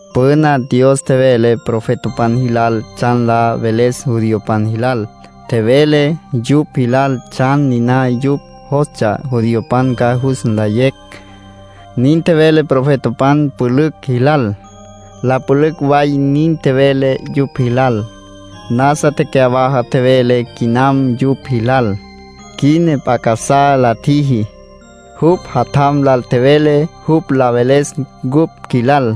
Püna Dios tjevele profetapan jilal tsjan la veles judiopan jilal. Tjevele yupj jilal tsjan niná jupj jostsja judiopan ca jus nlayecj. Nin tjevele profetapan pülücj jilal. La pülücj way nin tjevele yupj jilal. Nasa tecyawaja tjevele quinam yupj jilal. Quina p'a casá la tjiji. Jupj Jatjam lal tjevele jupj la veles cupj qjuilal.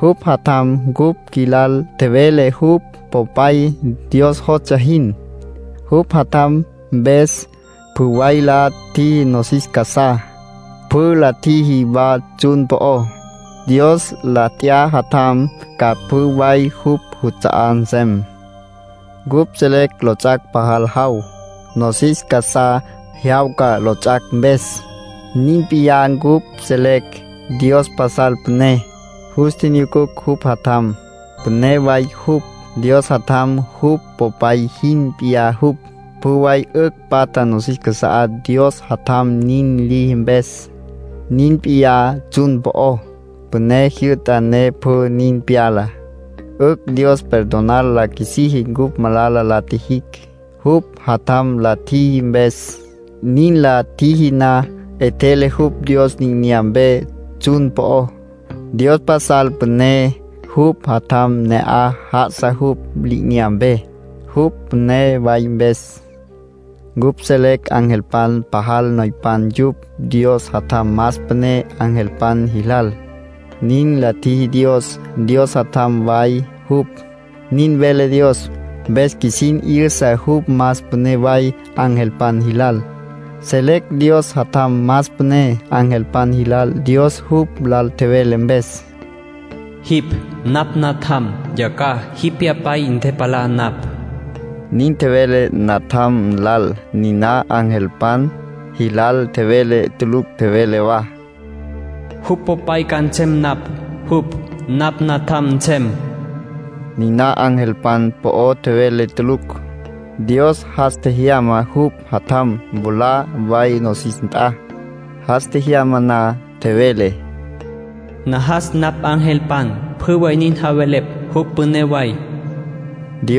Jupj Jatjam cupj qjuilal tjevele jupj Popay Dios jostsja jin. Jupj Jatjam mpes, pjü way la tjiji nosis casá. Pjü la tjiji wa tsjun po'ó. Dios la t'ya Jatjam, ca pjü way jupj juts'a'á nsem. Cupj selecj lots'ac' pajal jaw; nosis casá jyawca lots'ac' mpes. Nin p'iyá, cupj selecj Dios pasal püné; jus tjinyucucj jupj Jatjam, püné way jupj. Dios Jatjam, jupj Popay jin p'iyá jupj. Pjü way 'ücj patja nosis casá Dios Jatjam nin liji mpes. Nin p'iyá tsjun po'ó. Püné jyü'ta ne pjü nin pyala. 'Ücj Dios perdonar la qjuisiji cupj malala la tjijicj, jupj Jatjam la tjiji mpes. Nin la tjiji na, 'etjele jupj Dios li'inyampe tsjun po'ó. Dios pasal püné; jupj Jatjam ne'aj já'asa jupj li'inyampe, jupj püné wa mpes. Cupj selecj angelpan pajal noypan yupj. Dios Jatjam más püné angelpan jilal, nin la tjiji Dios. Dios Jatjam way jupj, nin vele Dios. Mpes qjuisin 'yüsa jupj más püné way angelpan jilal. Selecj Dios Jatjam más püné angelpan jilal Dios jupj lal tjevele mpes: “Jipj napj Natjam. Yacjaj jipj Pyapay ntepalá napj.” Nin tjevele Jatjam lal. Niná angelpan jilal tjevele tulucj. Tjevele wa: “Jupj Popay ca nsem napj. Jupj napj Natjam nsem.” Niná angelpan po'o tjevele tulucj. Dios jas tjejyama jupj Jatjam mwalá way nosis nt'a. Jas tjejyama na, tjevele: “Najas napj angelpan pjü way nin javelepj jupj püné way”, nin tjevele Dios.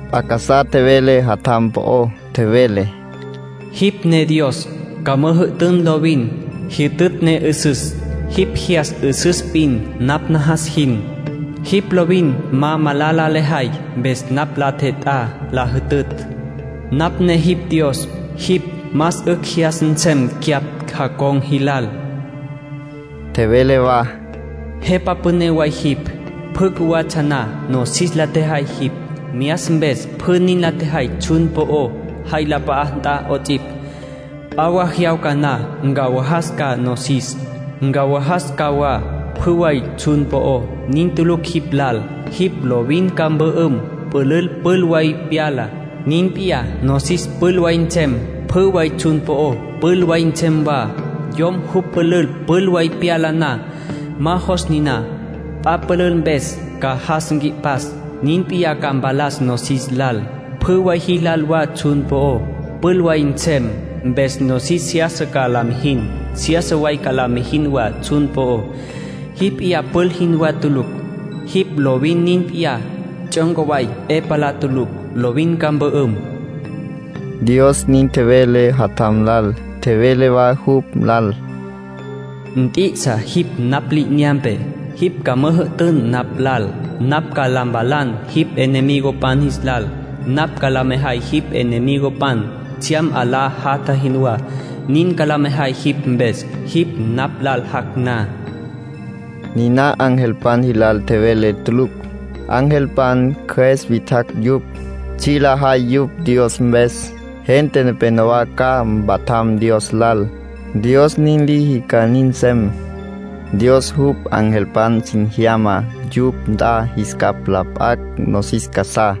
P'a casá tjevele Jatjam po'ó. Tjevele: “Jipj ne Dios. Ca müjü'tün lovin. Jyütütj ne 'üsüs. Jipj jyas 'üsüs p'in napj najas jin. Jipj lovin ma malala lejay. Mpes napj la 'e tjet'á la jütütj. Napj ne jipj Dios. Jipj más 'ücj jyas nsem cyapj jacon̈ jilal.” Dios nin tjevele. Tjevele wa: “Jepa Püné way jipj. Pjü cjuwatsja na, nosis la tjejay jipj. Myas mpes pjü nin la tjejay tsjun po'ó, jay la p'a'á nt'a 'ots'ipj. P'a wa jyawca na, ncawajas ca nosis. Ncawajas ca wa pjü way tsjun po'ó. Nin tulucj jipj lal. Jipj lovin ca mpü'üm. Pülül pül way pyala. Nin p'iyá, nosis pül way nsem. Pjü way tsjun po'ó pül way nsem wa. Yom jupj pülül pül way pyala na, ma jos niná. P'a pülül mpes ca jas nqui'pas. Nin p'iyá ca mpalas nosis lal, pjü way jilal wa tsjun po'ó. Pül way nsem. Mpes nosis seyasa ca la mijin. Seyasa way ca la mijin wa tsjun po'ó. Jipj p'iyá pül jinwá tulucj. Jipj lovin nin p'iyá. Tsjyonca way 'e palá tulucj. Lovin ca mpü'üm.” Dios nin tjevele Jatjam lal. Tjevele wa jupj lal: “Nt'i'isa jipj napj li'inyampe. Jipj ca müjü'tün napj lal. Napj ca la mpalan jipj enemigopan jis lal. Napj ca la mejay jipj enemigopan tsjyam 'alá jatja jinwá. Nin ca la mejay jipj mpes, jipj napj lal jac' na.” Niná angelpan jilal tjevele tulucj. Angelpan cjües witjacj yupj, tsji' lajay yupj Dios mpes. Gente nepénowa ca mpatjam Dios lal, Dios nin liji ca nin nsem. Dios jupj angelpan sin jyama yupj nt'a jis capj la p'acj nosis casá.